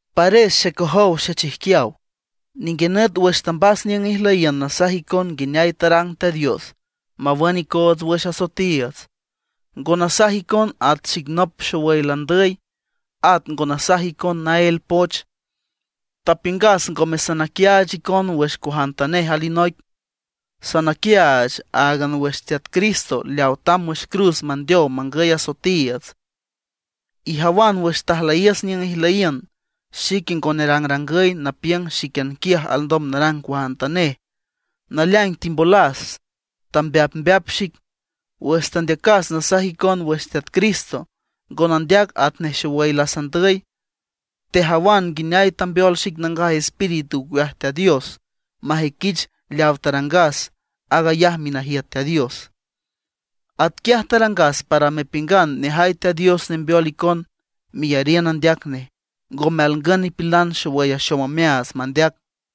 Pares xecojow xechijquiaw, ninguinüt wüx tambas niüng ijlüyiün nasaj icon nguineay tarang Teat Dios mawün icoots wüx asoetiiüts, ngo nasaj icon at xic nop xowüy landüy, at ngo nasaj icon naél poch. Tapiüngas ngome sanaquiaach icon wüx cuajantanej alinoic, sanaquiaach áagan wüx Teat Cristo leaw tamb wüx cruz mandeow mangüy asoetiiüts. Ijawan wüx tajlüyiüs niüng ijlüyiün, xique ngo nerangrangüy napiüng xíquian quiaj alndom narang cuajantanej. Naleaing timbolas, tambeapmbeap xic. Wüx tandeacas nasaj icon wüx Teat Cristo, ngo nandeac atnej xowüy lasandüy. Tejawan nguineay tambeol xic Nangaj Espíritu ocueaj Teat Dios majüiquich leaw tarangas aag ayaj minajiüt Teat Dios. Atquiaj tarangas para mepiüngan nejay Teat Dios nembeol icon meyariün andeac nej, ngome alngün nipilan xeyay axom omeaats mandeac.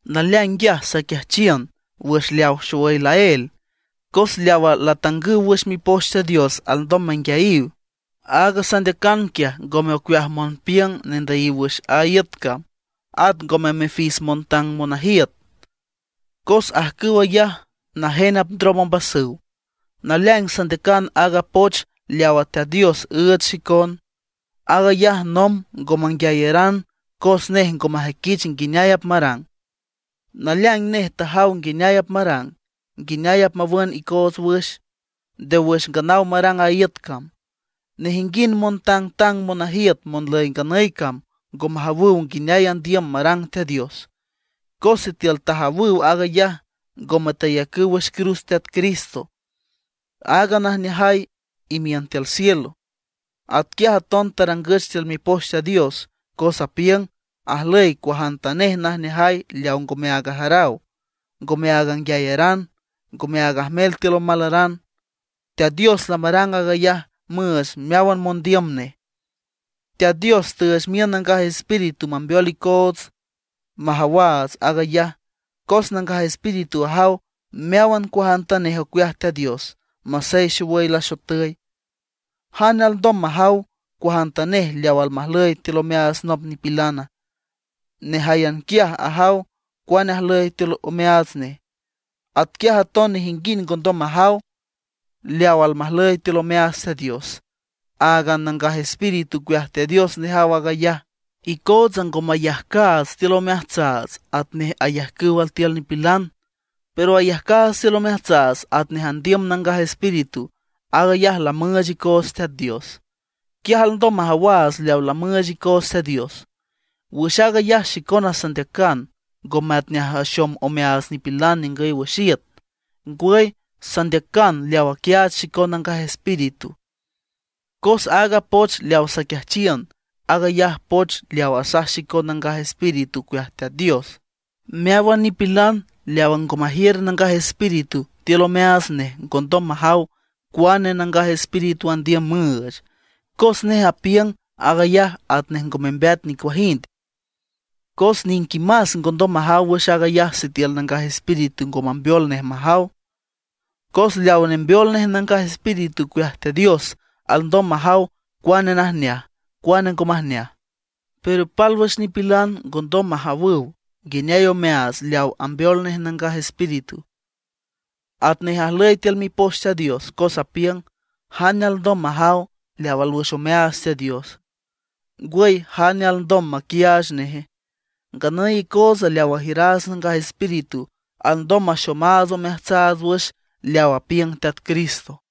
Naleaing nguiaj saquiajchiün wüx leaw xowüy laél, cos leawa latangüw wüx Mipoch Teat Dios alndom manguiayiw. Aaga sandeacan quiaj ngome ocueaj monpiüng nendüyiw wüx a iüt cam, at ngome mifis montang monajiüt, cos ajcüw ayaj najen apndrom ombasüw. Naleaing sandeacan aaga poch leaw Teat Dios üüch xicon. Aag ayaj nomb ngo manguiayaran cos nej ngo majüiquich nguineay apmarang. Naleaing nej tajaw nguineay apmarang, nguineay apmawün icoots wüx, nde wüx nganaw marang a iüt cam. Nejinguind montangtang monajiüt monlüy nganüy cam ngo majawüw nguineay andiüm marang Teat Dios. Cos sitiül tajawüw aag ayaj, ngome tayacüw wüx cruz Teat Cristo, aaga najneajay imiün tiül cielo. Atquiaj aton tarangüch tiül Mipoch Teat Dios, cos apiüng: Ajlüy cuajantanej najneajay leaw ngome áag ajaraw, ngome áag anguiayaran, ngome áag ajmel tiül omalaran. Teat Dios lamarang aag ayaj müüch meáwan mondiüm nej. Teat Dios tüüch miün aaga Nangaj Espíritu mambeol icoots majawaats aag ayaj. Cos Nangaj Espíritu ajaw meáwan cuajantanej ocueaj Teat Dios, masey xowüy laxotüy. ¿Jane alndom majaw cuajantanej leawa almajlüy tiül omeaats nop nipilana? Nejáyan quiaj ajaw cuane ajlüy tiül omeaats nej. Atquiaj aton nejinguind ngondom majaw leawa almajlüy tiül omeaats Teat Dios, áagan a Nangaj Espíritu ocueaj Teat Dios nejaw aag ayaj. Icootsa ngo mayajcaats tiül omeajtsaats atnej ayajcüw altiül nipilan; pero ayajcaats tiül omeajtsaats atnej andiüm Nangaj Espíritu, aag ayaj lamüüch icoots Teat Dios. Quiaj alndom majawaats leawa lamüüch icoots Teat Dios. Wüx aag ayaj xicona sandeacan, ngome atnej axom omeaats nipilan ningüy wüx iüt; ngwüy sandeacan leaw aquiaach xicon Nangaj Espíritu. Cos aaga poch leawa saquiajchiün, aag ayaj poch leaw asaj xicon Nangaj Espíritu ocueaj Teat Dios. Meáwan nipilan leawa ngo majiür Nangaj Espíritu tiül omeaats nej ngondom majaw cuane Nangaj Espíritu andiüm müüch, cos nej apiüng aag ayaj atnej ngo membeat nicuajind. Cos niquimas ngondom majaw wüx aag ayaj sitiül Nangaj Espíritu ngo mambeol nej majaw. Cos leaw nembeol nej Nangaj Espíritu ocueaj Teat Dios alndom majaw cuane najneaj, cuane ngo majneaj. Pero pálwüx nipilan ngondom majawüw nguineay omeaats leaw ambeol nej Nangaj Espíritu. Atnej ajlüy tiül Mipoch Teat Dios, cos apiüng: “¿Jane alndom majaw leaw alwüx omeaats Teat Diosa? ¿Ngwüy, jane alndom maquiaach neje?” Nganüy icootsa leaw ajiüraats Nangaj Espíritu alndom maxomaats omeajtsaats wüx leaw apiüng Teat Cristo.